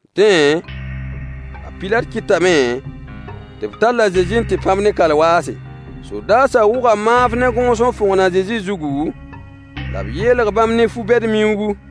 Dẽ, a Pilat kɩtame tɩ b tall a Zezi n tɩ pãb-b ne kalwaase. Sodaasã wʋga maanf ne gõos n fõgen a Zezi zugu, la b yeelg bãmb ne fu-bed miuugu,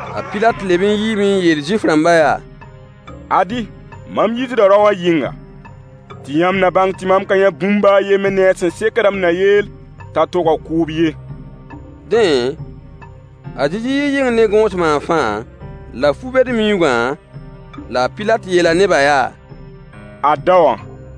A Pilate leb n yiime n yeel Zuif-rãmbã yaa: Ad-y, mam yiisda rao wã yɩnga, tɩ yãmb na bãng tɩ mam ka yã bũmb baa a yembr ne-a sẽn sekd m na yeel t'a toga kʋʋb ye. Dẽ, a Zezi yii yɩng ne gõos maanfã, la fu-bed-miuugã, la a Pilat yeela nebã yaa: Ad daowã!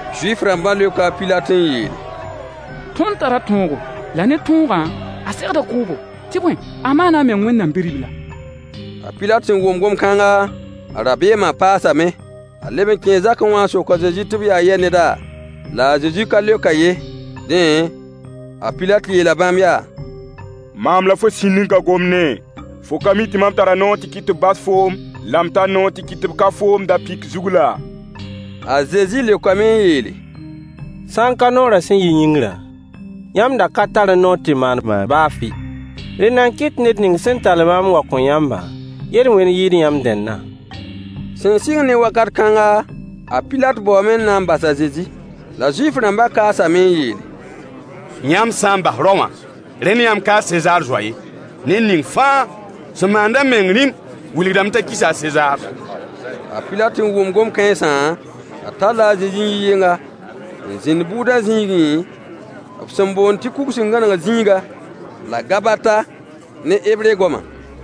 Zuif-rãmbã leoka a Pilat n yeele: Tõnd tara tõogo, la ne tõogã, a segda kʋʋbo, tɩ bõe, a maana a meng Wẽnnaam Bi-ribla. A Pilat sẽn wʋm gom-kãnga, a rabeemã paasame. A leb n kẽe zakẽ wã n sok a Zezi tɩ b yaa yɛ neda? La a Zezi ka leok-a ye. Dẽ, a Pilat yeela bãmb yaa: Maam la fo sĩnd n ka gomd-ne? Fo ka mi tɩ mam tara noor tɩ kɩt tɩ b bas foom, la m tar noor tɩ kɩt tɩ b ka foom da-pɩk zug laa? A Zezi leokame n yeele: Sã n ka noorã sẽn yi yĩngrã, yãmb da ka tarẽ noor tɩ maan maam baa fɩ. Rẽnda n kɩt tɩ ned ning sẽn tall maam n wa n kõ yãmbã yel-wẽnd yɩɩd yãmb dẽndã. Sẽn sɩng ne wakat kãnga, a Pilat baoome n na n bas a Zezi. La Zuif-rãmbã kaasame n yeele: Yãmb sã n bas rao wã, rẽnd yãmb ka Sezaar zoa ye. Ned ning fãa sẽn maand a meng rĩm wilgdame t'a kisa Sezaar. A Pilat sẽn wʋm gom-kãensã, a talla a Zezi n yi yɩnga, n zĩnd bʋʋdã zĩigẽ, b sẽn boond tɩ kug sẽn gãneg zĩiga, la Gabata ne hebre goama.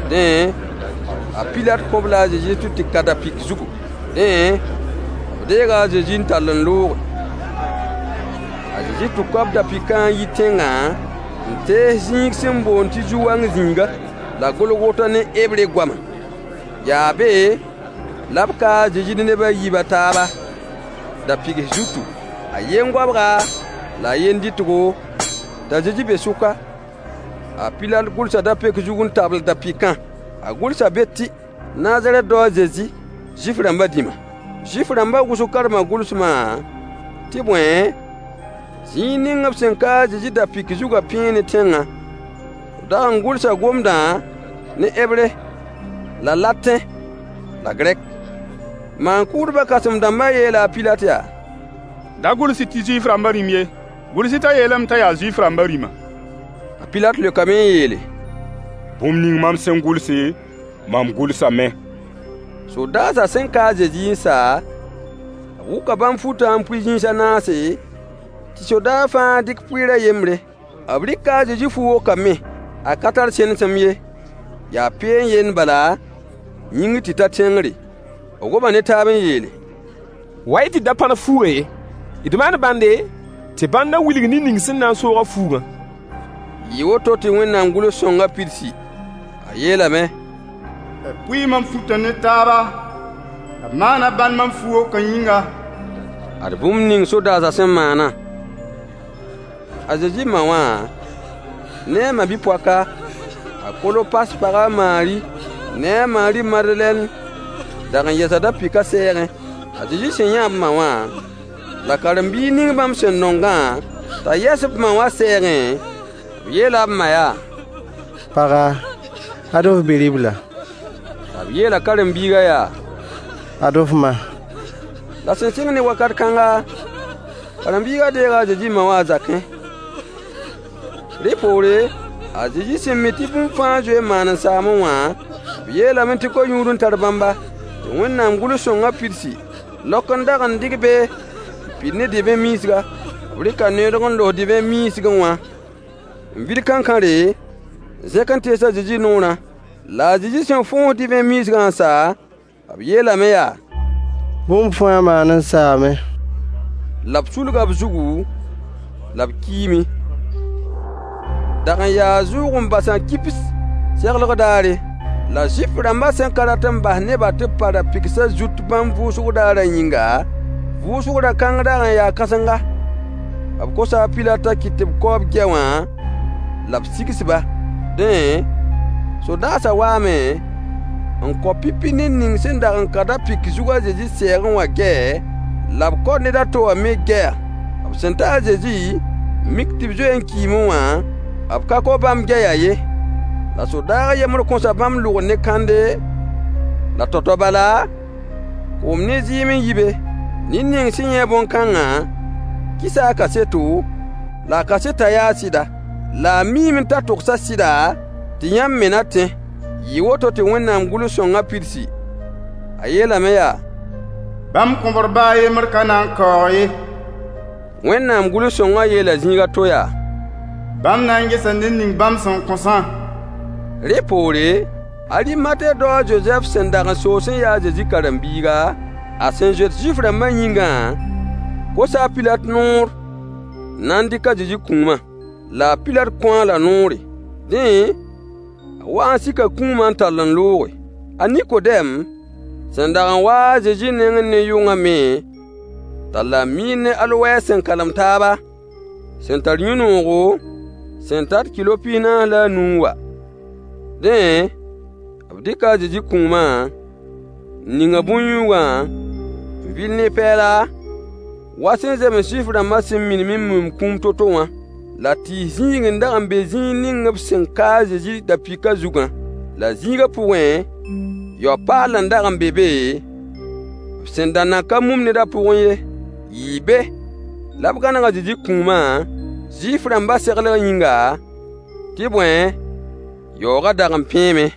Dẽ, a Pilat kõ-b-la a Zezi tɩ b tɩ ka da-pɩk zugu. Dẽ, b deega a Zezi [n tall n looge.] A Zezi tʋka b ra-pɩkã n yi tẽngã, n tees zĩig sẽn boond tɩ zu-wang zĩiga, la Golgota ne hebre goama. Yaa be la b ka a Zezi ne neb a yiib a taaba, da-pɩgs zutu, a yen goabga la a yen dɩtgo, t'a Zezi be sʋka. A Pilat gʋlsa da-peok zug n tabl da-pɩkã. A gʋlsa be tɩ: Nazarɛt dao a Zezi, Zuif-rãmbã dĩma. Zuif-rãmbã wʋsg karma gʋlsmã, tɩ bõe, zĩig ning b sẽn ka a Zezi da-pɩk zugã pẽe ne tẽngã. B dag n gʋlsa gomdã ne Hebre, la Latẽ, la Gɛrk. Maan-kʋʋdbã kãsem-dãmbã yeela a Pilat yaa: Da gʋls-y tɩ Zuif-rãmbã dĩm ye, gʋls-y t'a yeelame t'a yaa Zuif-rãmbã dĩma. A Pilat leokame n yeele: Bũmb ning mam sẽn gʋlse, mam gʋlsame. Sodaasã sẽn ka a Zezi n sa, b wʋka bãmb futã n pʋɩ zĩis a naase, tɩ sodaag fãa dɩk pʋɩɩr a yembre. B rɩka a Zezi fu-wokã me. A ka tar sẽnesem ye, yaa peen yend bala, yĩngr tɩ ta tẽngre. B goma ne taab n yeele: Wa-y tɩ d da pãrs fuugã ye. D maan bãnde, tɩ bãndã wilg ned ning sẽn na n soog-a fuugã. Yɩɩ woto tɩ Wẽnnaam gʋls-sõngã pidsi. A yeelame: B pʋɩɩ mam futã ne taaba, la b maana bãnd mam fu-wokã yĩnga. Ad bũmb ning sodaasã sẽn maanã. A Zezi ma wã ne a ma-bi-poaka, a Kolopas pag a Maari ne a Maari Madelɛn dag n yɛsa da-pɩkã sɛɛgẽ. A Zezi sẽn yã b ma wã, la karen-biig ning bãmb sẽn nongã, t'a yɛs b ma wã sɛɛgẽ, b yeela b ma yaa: Paga, ad f bi-ribla. La b yeela karen-biigã yaa: Ad f ma. La sẽn sɩng ne wakat kãnga, karen-biigã deega a Zezi ma wã a zakẽ. Rẽ poore, a Zezi sẽn mi tɩ bũmb fãa zoe n maan n saame wã, b yeelame tɩ ko-yũud n tar bãmba, tɩ Wẽnnaam gʋls-sõngã pidsi. Laok n dag n dɩg be n pid ne divẽ miisga. B rɩka neoodg n los divẽ miisgẽ wã, n vil kãnkãre, n zẽk n tees a Zezi noorã. La a Zezi sẽn fõos divẽ miisgã n sa, b yeelame yaa: Bũmb fãa maan n saame. La b sulga b zugu, la b kiime. Dag n yaa zʋʋg-n-basã kibs seglg daare. Yaa zʋʋg-n-basã kibs be tɩ beoogo. La Zuif-rãmbã sẽn ka rat n bas nebã tɩ b pa ra-pɩgsã zut bãmb vʋʋsg daarã yĩnga, “Vʋʋsg da-kãng dag n yaa da-kãsenga,” b kosa a Pilat t'a kɩt tɩ b kao b gɛy wã la b sigs-ba. Dẽ, sodaasã waame, n kao pipi ned ning sẽn dag n ka da-pɩk zug a Zezi sɛɛgẽ wã gɛy, la b kao ned a to wã me gɛya. B sẽn ta a Zezi, n mik tɩ b zoe n kiime wã, b ka kao bãmb gɛyã ye. La sodaag a yembr kõsa bãmb lʋgr ne kãnde, la tao-tao bala, koom ne zɩɩm n yi be. Ned ning sẽn yã bõn-kãngã kɩsa a kaseto, la a kasetã yaa sɩda. La a miime t'a togsa sɩda, tɩ yãmb me na tẽ. Yɩɩ woto tɩ Wẽnnaam gʋls-sõngã pidsi. A yeelame yaa: Bãmb kõbr baa a yembr ka na n kaoog ye. Wẽnnaam gʋls-sõngã yeela zĩig a to yaa: Bãmb na n gesa ned ning bãmb sẽn kõsã. Rẽ poore, Arimate dao a Zozɛf sẽn dag n soos n ya a Zezi karen-biiga, a sẽn zoet Zuif-rãmbã yĩngã kosa a Pilat noor n na n dɩk a Zezi kũumã. La a Pilat kõ-a-la noore. Dẽ, a waa n sika kũumã n tall n looge. A Nikodɛm, sẽn dag n wa-a a Zezi nengẽ ne yʋngã me talla miir ne alowɛs Alowɛs Yaa vãad buud sẽn tar yũugu. sẽn kalem taaba, sẽn tar yũ-noogo, sẽn tat kɩlo pis-naas la a nu n wa. Dẽ, b dɩka a Zezi kũuma, n ning-a bõn-yũugã, n vil ne pɛɛla, wa sẽn zems Zuif-rãmbã sẽn minim n mumd kũum to-to wã. La tɩɩs zĩig n dag n be zĩig ning b sẽn ka a Zezi da-pɩkã zugã, la zĩigã pʋgẽ, yao-paall n dag n be be b sẽn da nan ka mum ned a pʋgẽ ye. Yɩɩ be la b gãneg a Zezi kũumã, Zuif-rãmbã seglg yĩnga, tɩ bõe, yaoogã dag n pẽeme.